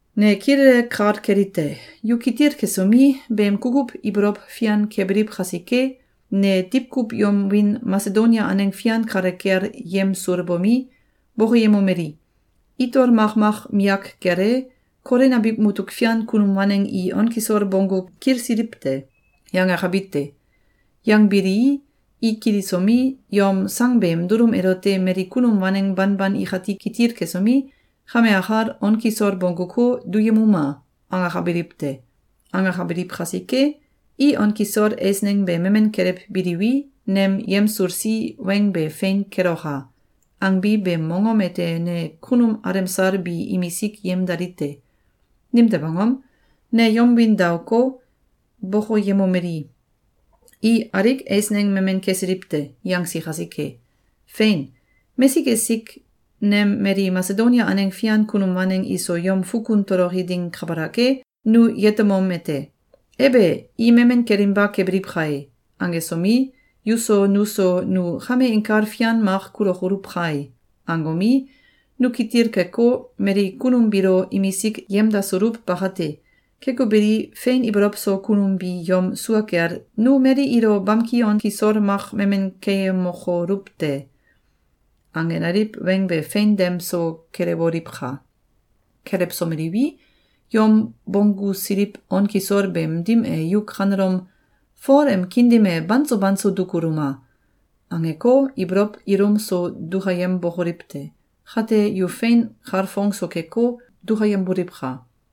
Ne kilele kal kelite: Yu kitil kesomi, beem kukuw ibolow fian kebiliw kasike, ne diwkuw yom wiin Masedonia aneng fian kale kel yemsulbomi, bokoyemomeli: “Itol makmak miyak kel e, Kolin abiw mutuk fian kunum waneng i on kisol bonggu kilsiliw te!”, yangakabi te. Yangbilii, i kilisomi, yom sang beem dulum elote mali kunum waneng banban ikati kitil kesomi, “Kame akal on kisol bongguko, duyemuma!”, angakabiliw te. Angakabiliw kasike, “I on kisol eisneng be memen kelewbiliwi, nem yemsulsi weng be fein keloka!”, angbi beem mongom ete ne kunum alemsal bi imisik yemdali te. Nimtew angom? Ne yom wiin daoko, bokoyemomeli: “I alik eisneng memen kesiliw te!”, yangsi kasike. Fein! Mesik esik nem mali Masedonia aneng fian kunum waneng iso yom fukun toloki ding kabalak e, nu yetemom ete: “Ebe! I memen kelinba kebiliw kae!”, angesomi, yuso nuso “Nu kame inkal fian mak kulokoluw kai!”, angomi, nu kitil keko, mali kunum biilo imisik yemdasuluw bakate. Keko beli, fein ibolow so kunum bi yom sua kel “Nu mali ilo bamki on kisol mak memen keyemokoluw te!”, angenaliw weng be fein dem so kelewoliwka! Kelewsomeliwi, yom bonggusiliw on kisol beem dim e yu kanelom “Fol em kiin dim e banso banso dukuluma!”, angeko, ibolow ilum so dukayembokoliw te! Kate, yu fein kalfong so keko, dukayemboliwka!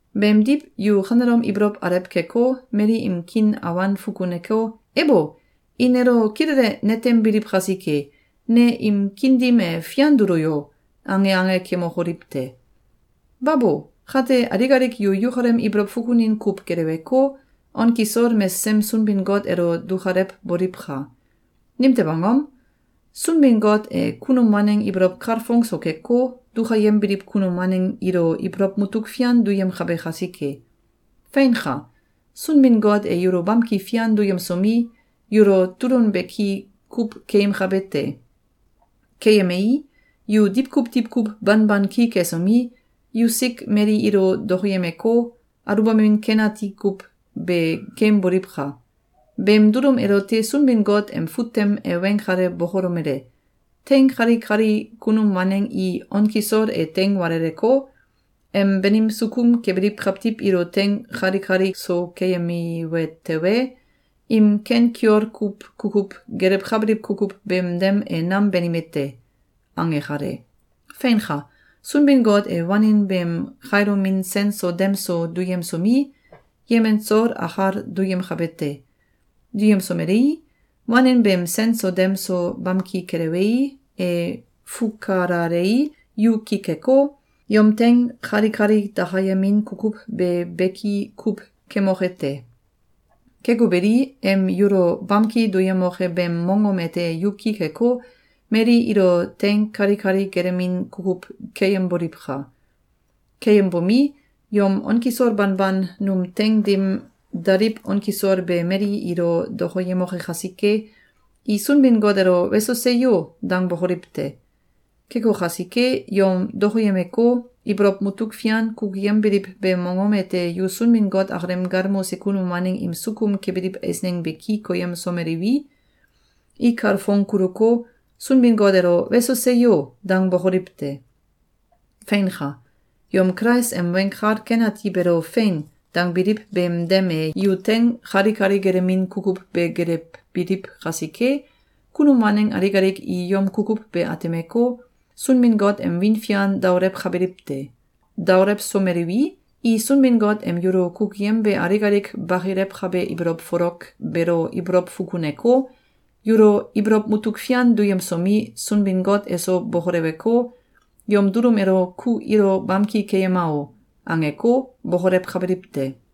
Beemdiw, yu kanelom ibolow alew keko, mali im kiin awan fukuneko, “Ebo! I nelo kilele netembiliw kasike, ne im kiin dim e fian dulo yo!”, ange ange kemokoliw te! Babo! Kate, alik alik yu yukalem ibolow fukunin kuw geleweko, on kisol mesesem Sunbin-Got elo dukalewboliwka! Nimtew angom? Sunbin-Got e kunum waneng ibolow kalfong so keko, dukayembiliw kunum waneng ilo ibolow mutuk fian duyemkabe kasike. Feinka! Sunbin-Got e yulo bamki fian duyemsomi, yulo tulun beki kuw keyemkabe te. Keyemei, yu diwkuw diwkuw banban ki kesomi, yusik mali ilo dokoyemeko, aluwbamin ken ati kuw be keemboliwka! Beem dulum elote Sunbin-Got em fut tem e weng kale bokolomele: “Teing kalikali kunum waneng i on kisol e teing waleleko, em banim sukum kebiliw kawtiw ilo teing kalikali so keyemiwe tewe, im ken kiol kuw kukuw gelewkabiliw kukuw beem dem e nam banime te.”, ange kale. Feinka! Sunbin-Got e wanin beem kailomin sen so dem so duyemsomi, yemen soul akal duyemkabe te. Duyemsomelei, wanin beem sen so dem so bamki kelewei, e fukalalei, yu ki keko, yom teing kalikali dakayemin kukuw be beki kuw kemoke te. Keko beli, em yulo bamki duyemoke beem mongom ete yu ki keko, mali ilo teing kalikali gelemin kukuw keyemboliwka! Keyembomi, yom on kisol banban num teing dim daliw on kisol be mali ilo dokoyemoke kasike, i Sunbin-Got elo “Weso! Seyo!”, dangbokoliw te. Keko kasike, yom dokoyemeko, ibolow mutuk fian kukuyembiliw beem mongom ete yu Sunbin-Got akalem galmose kunum waneng im sukum kebiliw eisneng be ki koyemsomeliwi, i kalfong kuluko, Sunbin-Got elo “Weso! Seyo!”, dangbokoliw te. Feinka! Yom Kulais em Weng Kal Ken Ati beelo “Fein!”, dangbiliw beem dem e yu teing kalikali gelemin kukuw be gelewbiliw kasike, kunum waneng alik alik i yom kukuw be atemeko, Sunbin-Got em wiin fian daolewkabiliw te. Daolewsomeliwi, i Sunbin-Got em yulo kukuyembe alik alik bakilewkabe ibolow folok beelo ibolow fukuneko, yulo ibolow mutuk fian duyemsomi, Sunbin-Got eso bokoleweko, yom dulum elo “Ku ilo bamki keyema o!”, angeko, bokolewkabiliw te.